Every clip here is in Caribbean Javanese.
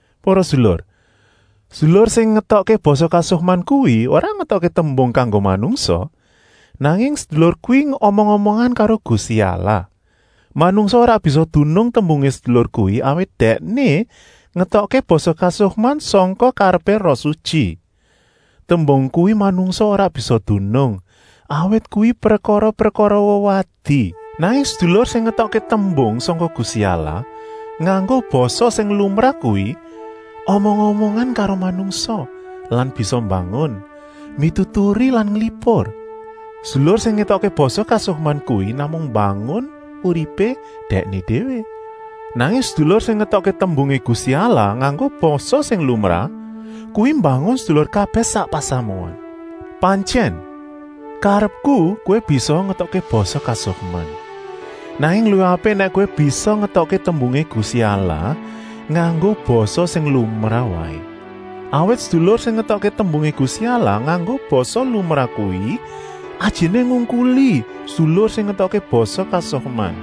Para sedulur, sedulur sing ngetokké basa kasukman kuwi ora ngetokké tembung kanggo manungsa, nanging sedulur kuwi omong-omongan karo Gusti Allah. Manungsa ora bisa dunung tembungé sedulur kuwi, awit dèkné ngetokké basa kasukman sangka karepé Roh Sutyi. Tembung kuwi manungsa ora bisa dunung, awit kuwi prekara-prekara wewadi. Nanging sedulur sing ngetokké tembung sangka Gusti Allah nganggo basa sing lumrah kuwi omong-omongan karo manungsa lan bisa mbangun, mituturi lan nglipur. Sedulur sing ngetokké basa kasukman kuwi namung mbangun uripé dèkné déwé, nanging sedulur sing ngetokké tembungé Gusti Allah nganggo basa sing lumrah kuwi mbangun sedulur kabèh sak pasamuan. Pantyèn, karepku kowé bisaa ngetokké basa kasukman, nanging luwih apik nèk kowé bisa ngetokké tembungé Gusti Allah nganggo basa sing lumrah waé. Awit sedulur sing ngetokké tembungé Gusti Allah nganggo basa lumrah kuwi ajiné ngungkuli sedulur sing ngetokké basa kasukman;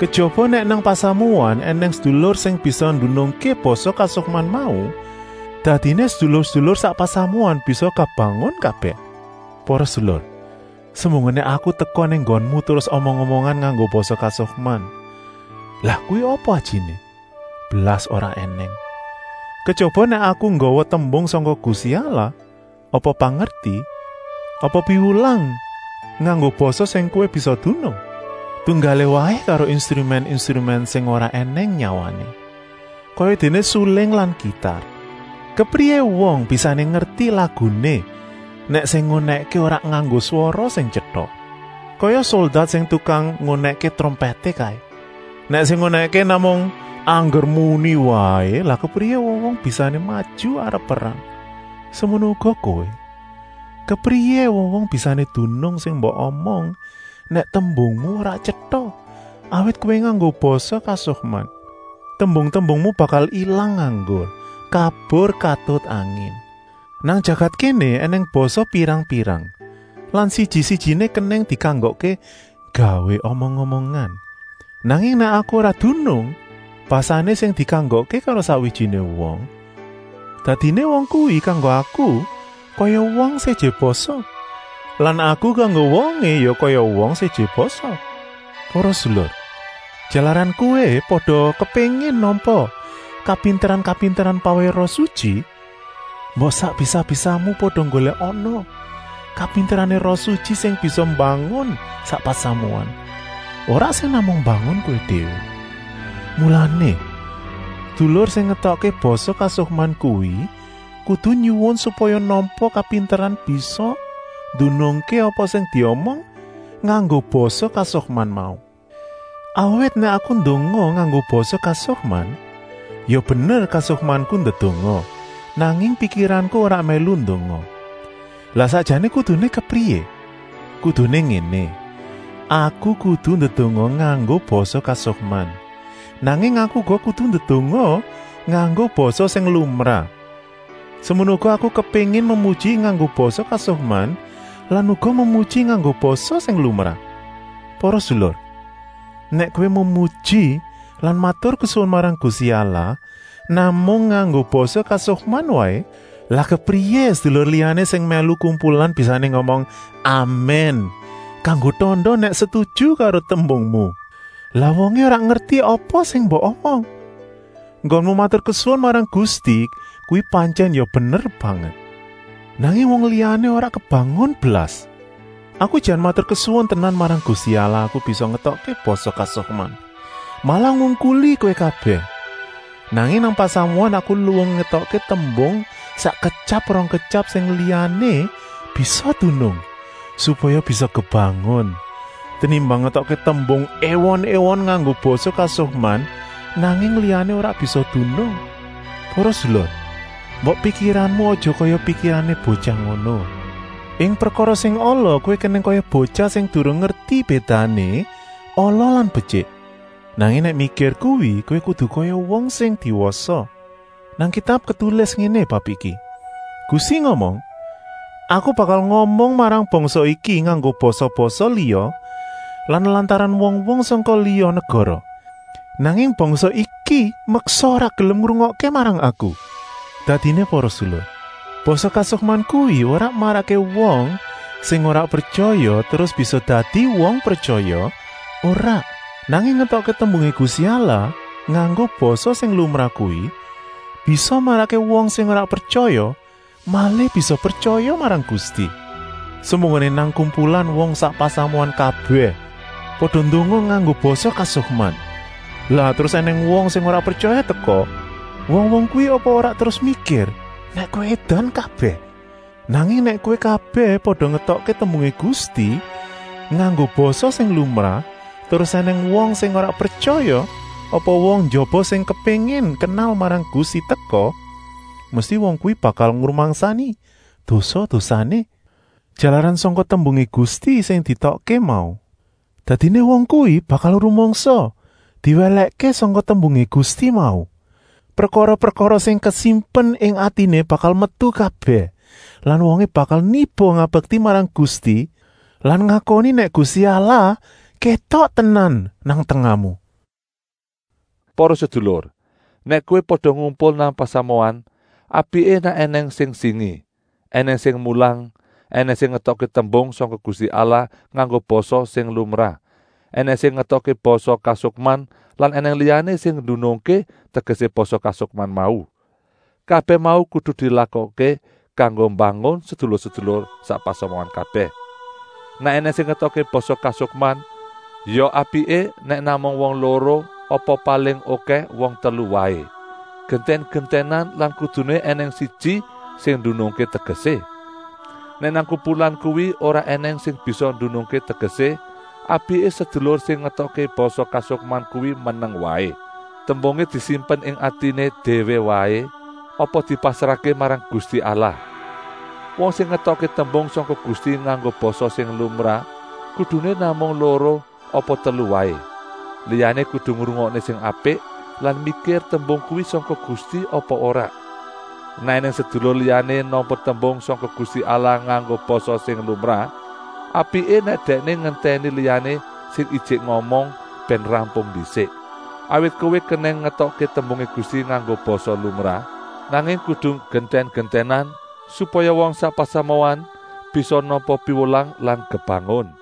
kejaba nèk nang pasamuan ènèng sedulur sing bisa ndunungké basa kasukman mau, dadiné sedulur-sedulur sak pasamuan bisa kebangun kabèh. Para sedulur, semunggoné aku teka nang nggonmu terus omong-omongan nganggo basa kasukman, lah kuwi apa ajiné? Blas ora ènèng, kejaba nèk aku nggawa tembung sangka Gusti Allah, apa pangerti, apa piwulang nganggo basa sing kowé bisa dunung. Tunggalé waé karo instrumèn-instrumèn sing ora ènèng nyawané, kayadéné suling lan kitar. Kepriyé wong bisané ngerti laguné nèk sing ngunèkké ora nganggo swara sing tyeta? Kaya soldat sing tukang ngunèkké trompèté kaé. Nèk sing ngunèkké namung angger muni waé, lah kepriyé wong-wong bisané maju arep perang. Semono uga kowé, kepriyé wong-wong bisané dunung sing mbok omong nèk tembungmu ora tyeta, awit kowé nganggo basa kasukman. Tembung-tembungmu bakal ilang nganggur, kabur katut angin. Nang jagat kéné ènèng basa pirang-pirang lan siji-sijiné kenèng dikanggokké gawé omong-omongan. Nanging nèk aku ora dunung basané sing dikanggokké karo sakwijiné wong, dadiné wong kuwi kanggo aku kaya wong séjé basa lan aku kanggo wongé ya kaya wong séjé basa. Para sedulur, jalaran kowé pada kepéngin nampa kapinteran-kapinteran pawèhé Roh Sutyi, mbok sak bisa-bisamu pada nggolèkana kapinterané Roh Sutyi sing bisa mbangun sak pasamuan, ora sing namung mbangun kowé déwé. Mulané, sedulur sing ngetokké basa kasukman kuwi kudu nyuwun supaya nampa kapinteran bisa ndunungké apa sing diomong nganggo basa kasukman mau. Awit nèk aku ndonga nganggo basa kasukman, ya bener kasukmanku ndedonga, nanging pikiranku ora mèlu ndonga. Lah sakjané kuduné kepriyé? Kuduné ngéné: aku kudu ndedonga nganggo basa kasukman, nanging aku uga kudu ndedonga nganggo basa sing lumrah. Semono uga aku kepéngin memuji nganggo basa kasukman lan uga memuji nganggo basa sing lumrah. Para sedulur, nèk kowé memuji lan maturkesuwun marang Gusti Allah namung nganggo basa kasukman waé, lah kepriyé sedulur liyané sing mèlu kumpulan bisané ngomong “Amèn,” kanggo tanda nèk setuju karo tembungmu; lah wongé ora ngerti apa sing mbok omong. Enggonmu maturkesuwun marang Gusti kuwi pantyèn ya bener banget, nanging wong liyané ora kebangun blas. Aku jan maturkesuwun tenan marang Gusti Allah aku bisa ngetokké basa kasukman, malah ngungkuli kowé kabèh. Nanging nang pasamuan aku luwung ngetokké tembung sakketyap-rongketyap sing liyané bisa dunung, supaya bisa kebangun, tenimbang ngetokké tembung èwon-èwon nganggo basa kasukman, nanging liyané ora bisa dunung. Para sedulur, mbok pikiranmu aja kaya pikirané botyah ngono. Ing prekara sing ala kowé kenèng kaya botyah sing durung ngerti bédané ala lan betyik. Nanging nèk mikir kuwi kowé kudu kaya wong sing wis diwasa. Nang Kitab ketulis ngéné bab iki: “Gusti ngomong: Aku bakal ngomong marang bangsa iki nganggo basa-basa liya lan lantaran wong-wong sangka liya negara, nanging bangsa iki meksa ora gelem ngrungokké marang Aku.” Dadiné para sedulur, basa kasukman kuwi ora marakké wong sing ora pretyaya terus bisa dadi wong pretyaya, ora. Nanging ngetokké tembungé Gusti Allah nganggo basa sing lumrah kuwi bisa marakké wong sing ora pretyaya malih bisa pretyaya marang Gusti. Semunggoné nang kumpulan wong sak pasamuan kabèh pada ndonga nganggo basa kasukman, lah terus ènèng wong sing ora pretyaya teka, wong-wong kuwi apa ora terus mikir nèk kowé édan kabèh? Nanging nèk kowé kabèh pada ngetokké tembungé Gusti nganggo basa sing lumrah, terus ènèng wong sing ora pretyaya apa wong njaba sing kepéngin kenal marang Gusti teka, mesti wong kuwi bakal ngrumangsani dosa-dosané, jalaran sangka tembungé Gusti sing dietokké mau. Dadiné wong kuwi bakal rumangsa diwèlèkké sangka tembungé Gusti mau. Prekara-prekara sing kasimpen ing atiné bakal metu kabèh lan wongé bakal niba ngabekti marang Gusti lan ngakoni nèk Gusti Allah kétok tenan nang tengahmu. Para sedulur, nèk kowé pada ngumpul nang pasamuan, apiké nèk ènèng sing singi, ènèng sing mulang, ènèng sing ngetokké tembung sangka Gusti Allah nganggo basa sing lumrah, ènèng sing ngetokké basa kasukman lan ènèng liyané sing ndunungké tegesé basa kasukman mau. Kabèh mau kudu dilakokké kanggo mbangun sedulur-sedulur sak pasamuan kabèh. Nèk ènèng sing ngetokké basa kasukman, ya apiké nèk namung wong loro apa paling okèh wong telu waé, gentèn-gentènan lan kuduné ènèng siji sing ndunungké tegesé. Nèk nang kumpulan kuwi ora ènèng sing bisa ndunungké tegesé, apiké sedulur sing ngetokké basa kasukman kuwi meneng waé. Tembungé disimpen ing atiné déwé waé apa dipasrahké marang Gusti Allah. Wong sing ngetokké tembung sangka Gusti nganggo basa sing lumrah kuduné namung loro apa telu waé, liyané kudu ngrungokké sing apik lan mikir tembung kuwi sangka Gusti apa ora. Nèk ènèng sedulur liyané nampa tembung sangka Gusti Allah nganggo basa sing lumrah, apiké nèk dèkné ngentèni liyané sing ijik ngomong bèn rampung ndisik. Awit kowé kenèng ngetokké tembungé Gusti nganggo basa lumrah, nanging kudu gentèn-gentènan, supaya wong sak pasamuan bisa nampa piwulang lan kebangun.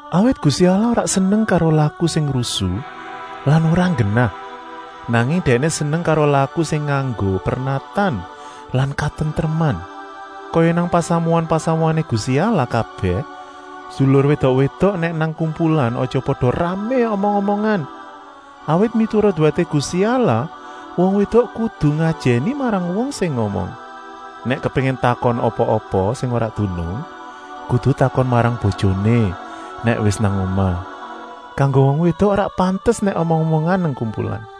Awit Gusti Allah ora seneng karo laku sing rusu lan ora nggenah, nanging Dèkné seneng karo laku sing nganggo pernatan lan katentreman. Kaya nang pasamuan-pasamuané Gusti Allah kabèh, sedulur wédok-wédok nèk nang kumpulan aja pada ramé omong-omongan, awit miturut wèté Gusti Allah wong wédok kudu ngajèni marang wong sing ngomong. Nèk kepéngin takon apa-apa sing ora dunung, kudu takon marang bojoné nèk wis nang omah. Kanggo wong wédok ora pantes nèk omong-omongan nang kumpulan.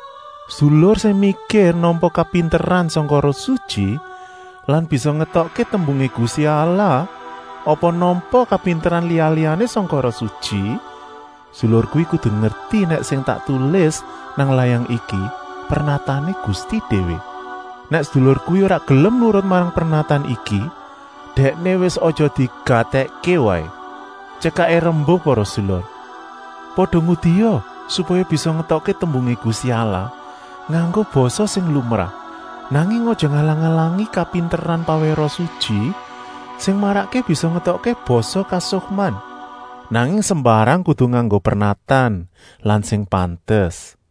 Sedulur sing mikir nampa kapinteran sangka Roh Sutyi lan bisa ngetokké tembungé Gusti Allah apa nampa kapinteran liya-liyané sangka Roh Sutyi, sedulur kuwi kudu ngerti nèk sing tak tulis nang layang iki pernatané Gusti déwé. Nèk sedulur kuwi ora gelem nurut marang pernatan iki, dèkné wis aja digatèkké waé. Tyekaké rembuk para sedulur, pada ngudia supaya bisa ngetokké tembungé Gusti Allah nganggo basa sing lumrah, nanging aja ngalang-alangi kapinteran pawèhé Roh Sutyi sing marakké bisa ngetokké basa kasukman. Nanging sembarang kudu nganggo pernatan lan sing pantes.